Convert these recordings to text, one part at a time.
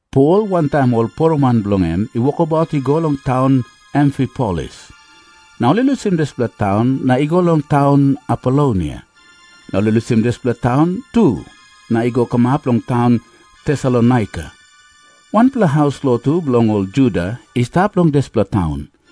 Pol wantaim ol poroman bilong en i wokabaut i go long taun Amfipolis. Na ol i lusim dispela taun na i go long taun Apolonia. Na ol i lusim dispela taun tu na i go kamap long taun Tesalonaika. Wanpela haus lotu bilong ol Juda i stap long dispela taun.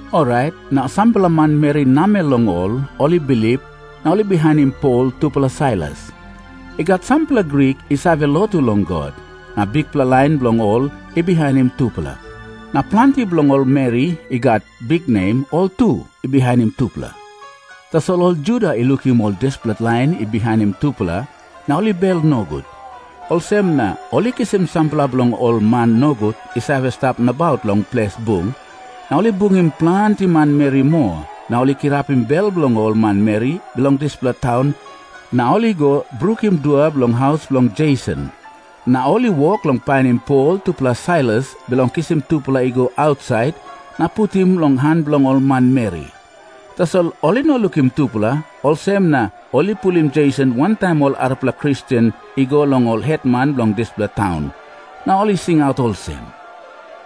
Orait na sampela manmeri namel long ol, ol i bilip, na ol i bihainim Pol tupela Sailas. I gat sampela Grik i save lotu long God, na bikpela lain bilong ol i bihainim tupela. Na planti bilong ol meri i gat biknem, ol tu i bihainim tupela. Tasol ol Juda i lukim ol dispela lain i bihainim tupela, na ol i bel nogut. Olsem na ol i kisim sampela bilong ol man nogut i save stap nabaut long ples bung. Na ol i bungim planti manmeri moa, na ol i kirapim bel bilong ol manmeri bilong dispela taun, na ol i go brukim dua bilong haus bilong Jeson. Na ol i wok long painim Pol tupela Sailas, bilong kisim tupela i go ausait na putim long han bilong ol manmeri. Tasol ol i no lukim tupela, olsem na ol i pulim Jeson wantaim ol arapela Kristen i go long ol hetman bilong dispela taun. Na ol i singaut olsem,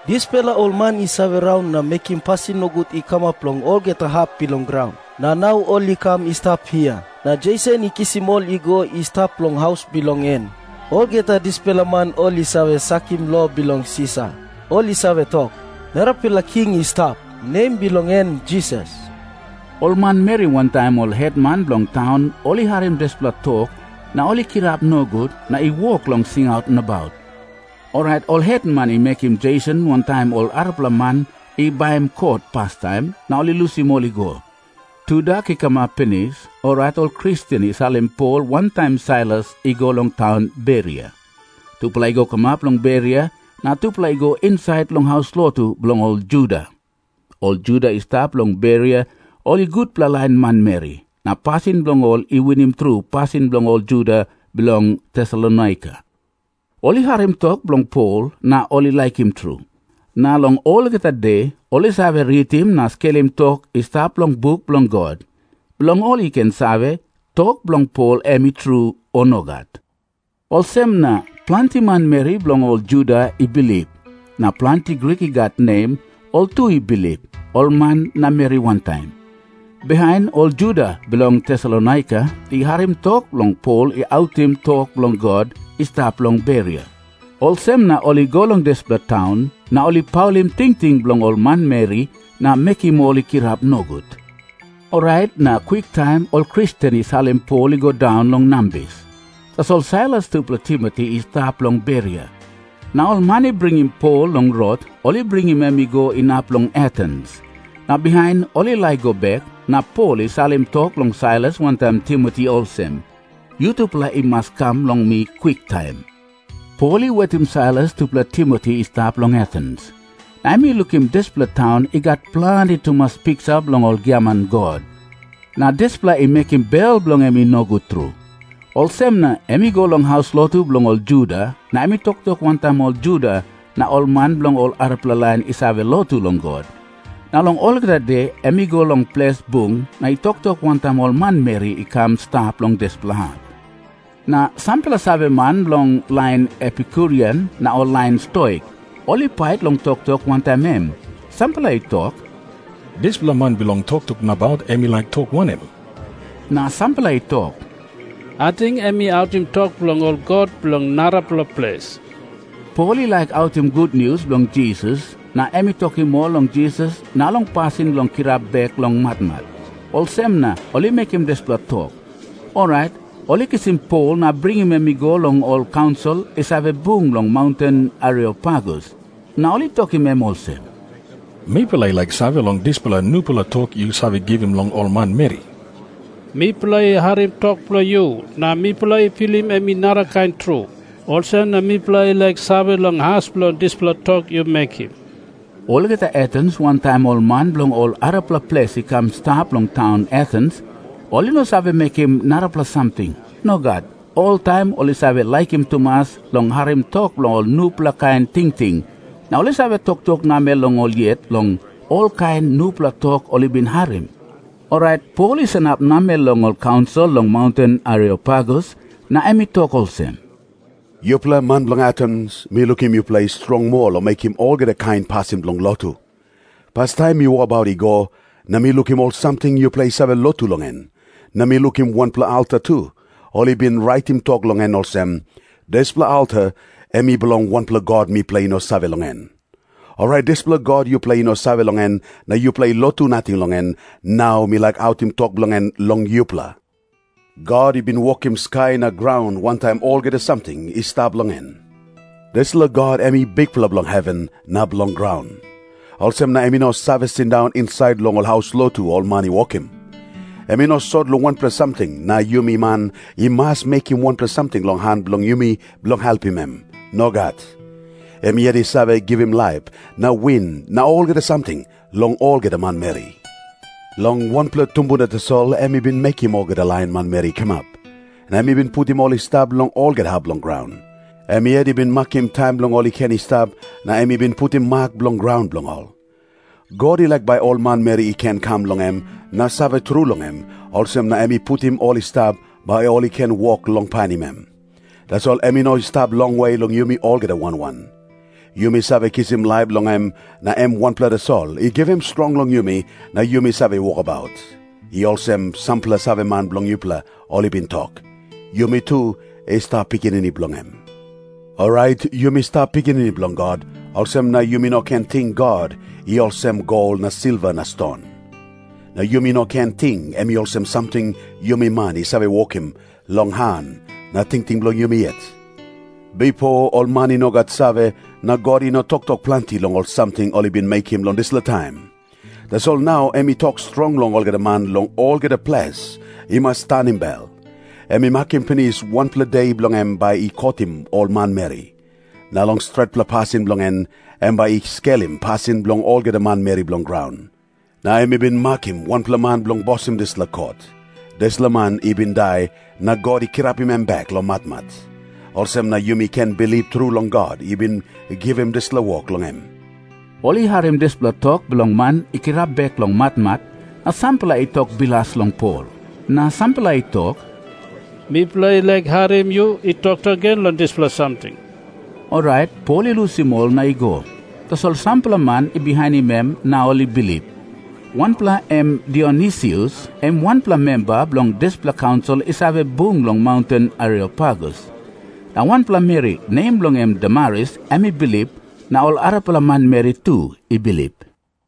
"Dispela ol man i save raun na mekim pasin nogut i kamap long olgeta hap bilong graun, na nau ol i kam i stap hia. Na Jeson i kisim ol i go i stap long haus bilong en. Olgeta dispela man ol i save sakim lo bilong Sisar. Ol i save tok, 'Narapela king i stap, nem bilong en Jisas.'" Ol manmeri wantaim ol hetman bilong taun ol i harim dispela tok, na ol i kirap nogut na i wok long singaut nabaut. Orait ol hetman i mekim Jeson wantaim ol arapela man i baim kot pastaim, na ol i lusim ol i go. Tudak i kamap pinis, orait ol Kristen i salim Pol wantaim Sailas i go long taun Beria. Tupela i go kamap long Beria, na tupela i go insait long haus lotu bilong ol Juda. Ol Juda i stap long Beria ol i gutpela lain manmeri, na pasin bilong ol i winim tru pasin bilong ol Juda bilong Tesalonaika. Ol i harim tok bilong Pol, na ol i laikim tru. Na long olgeta de ol i save ritim na skelim tok i stap long buk bilong God, bilong ol i ken save, tok bilong Pol em i tru, o nogat. Olsem na planti manmeri bilong ol Juda i bilip. Na planti Grik i gat nem, ol tu i bilip, ol man na meri wantaim. Bihain ol Juda bilong Tesalonaika i harim tok long Pol i autim tok bilong God i stap long Beria. Olsem na ol i go long dispela taun, na ol i paulim tingting bilong ol manmeri na mekim ol i kirap nogut. Orait na kwiktaim ol Kristen i salim Pol i go daun long nambis. Tasol Sailas tupela Timoti i stap long Beria. Na ol man i bringim Pol long rot, ol i bringim em i go inap long Atens. Na bihain ol i laik i go bek, na Pol i salim tok long Sailas wantaim Timoti olsem, "Yutupela i mas i kam long mi kwiktaim." Pol i wetim Sailas tupela Timoti i stap long Atens, na em i lukim dispela taun i gat planti tumas piksa bilong ol giaman god. Na dispela i mekim bel bilong en i nogut tru. Olsem na em i go long haus lotu bilong ol Juda na em i toktok wantaim ol Juda na ol man bilong ol arapela lain i save lotu long God. Na long olgeta de em i go long ples bung na i toktok wantaim ol manmeri i kam i stap long dispela hap. Na sampela saveman bilong ol lain Epikurian na ol lain Stoik, ol i pait long toktok wantaim em. Sampela i tok, "Dispela man bilong toktok nabaut em i laik tok wanem?" Na sampela i tok, "Ating em i autim tok bilong ol god bilong narapela ples." Pol i laik autim gutnius bilong Jisas na em i tokim ol long Jisas na long pasin bilong kirap bek long matmat, olsem na ol i mekim dispela tok. Orait ol i kisim Pol na bringim em i go long ol kaunsil i save bung long maunten Areopagus. Na ol i tokim em olsem, "Mipela i laik save long dispela nupela tok yu save givim long ol manmeri. Mipela i harim tok bilong yu, na mipela i pilim em i narakain tru. Olsem na mipela i laik save long as bilong dispela tok yu mekim." Olgeta Atens wantaim ol man bilong ol arapela ples i kam i stap long taun Atens, ol i no save mekim narapela samting. Nogat. Oltaim ol i save laikim tumas long harim tok long ol nupela kain tingting, na ol i save toktok namel long ol yet long olkain nupela tok ol i bin harim. Orait Pol i sanap namel long ol kaunsil long maunten Areopagus na em i tok olsem, "Yupela man bilong Atens, mi lukim yupela i strong moa long mekim olgeta kain pasin bilong lotu. Pastaim mi wokabaut i go, na mi lukim ol samting yupela i save lotu long en. Na mi lukim wanpela alta tu, ol i bin raitim tok long en olsem, 'Dispela alta em i bilong wanpela god mipela i no save long en.' Orait dispela God yupela i no save long en na yupela i lotu nating long en, nau mi laik autim tok bilong en long yupela. "God i bin wokim graun wantaim olgeta samting i stap long graun, dispela God em i Bikpela bilong heven na bilong graun. Olsem na em i no save sindaun insait long ol haus lotu ol man i wokim. Em i no sot long wanpela samting na yumi man i mas mekim wanpela samting long han bilong yumi bilong helpim em. Nogat. Em yet i save givim laip na win na olgeta samting long olgeta manmeri. Long wanpela tumbuna tasol em i bin mekim olgeta lain manmeri i kamap. Na em i putim ol i stap long olgeta hap bilong graun. Em yet i bin makim taim bilong ol i ken i stap, na em i bin putim mak bilong graun bilong ol. God i laik bai ol manmeri i ken kam long em na save tru long em, olsem na em i putim ol i stap, bai ol i ken wok long painim em. Tasol em i no i stap longwe long yumi olgeta wan wan. 'Yumi save kisim laip long em na em wanpela tasol i givim strong long yumi na yumi save wokabaut.' I olsem sampela saveman bilong yupela ol i bin tok, 'Yumi tu i stap pikinini bilong em.' Orait yumi stap pikinini bilong God, olsem na yumi no ken ting God em i olsem gol na silva na ston. Na yumi no ken ting em i olsem ol samting yumi man i save wokim long han na tingting bilong yumi yet. "Bipo ol man i no gat save, na God i no toktok planti long ol samting ol i bin mekim long dispela taim. Tasol nau em i tok strong long olgeta man long olgeta ples i mas tanim bel. Em i makim pinis wanpela de bilong em bai i kotim ol manmeri. Na long stretpela pasin bilong en, em bai i skelim pasin bilong olgeta manmeri bilong graun. Na em i bin makim wanpela man bilong bosim dispela kot. Dispela man i bin dai na God i kirapim em bek long matmat. Olsem na yumi ken bilip tru long God i bin givim dispela wok long em." Ol i harim dispela tok bilong man i kirap bek long matmat, na sampela i tok bilas long Pol. Na sampela i tok, "Mipela i laik harim yu i toktok gen long dispela samting." Orait Pol i lusim ol na i go. Tasol sampela man i bihainim em na ol i bilip. Wanpela em Dionisius, em wanpela memba bilong dispela kaunsil i save bung long maunten Areopagus. Na wanpela meri, nem bilong en Damaris, em i bilip, na ol arapela manmeri tu i bilip.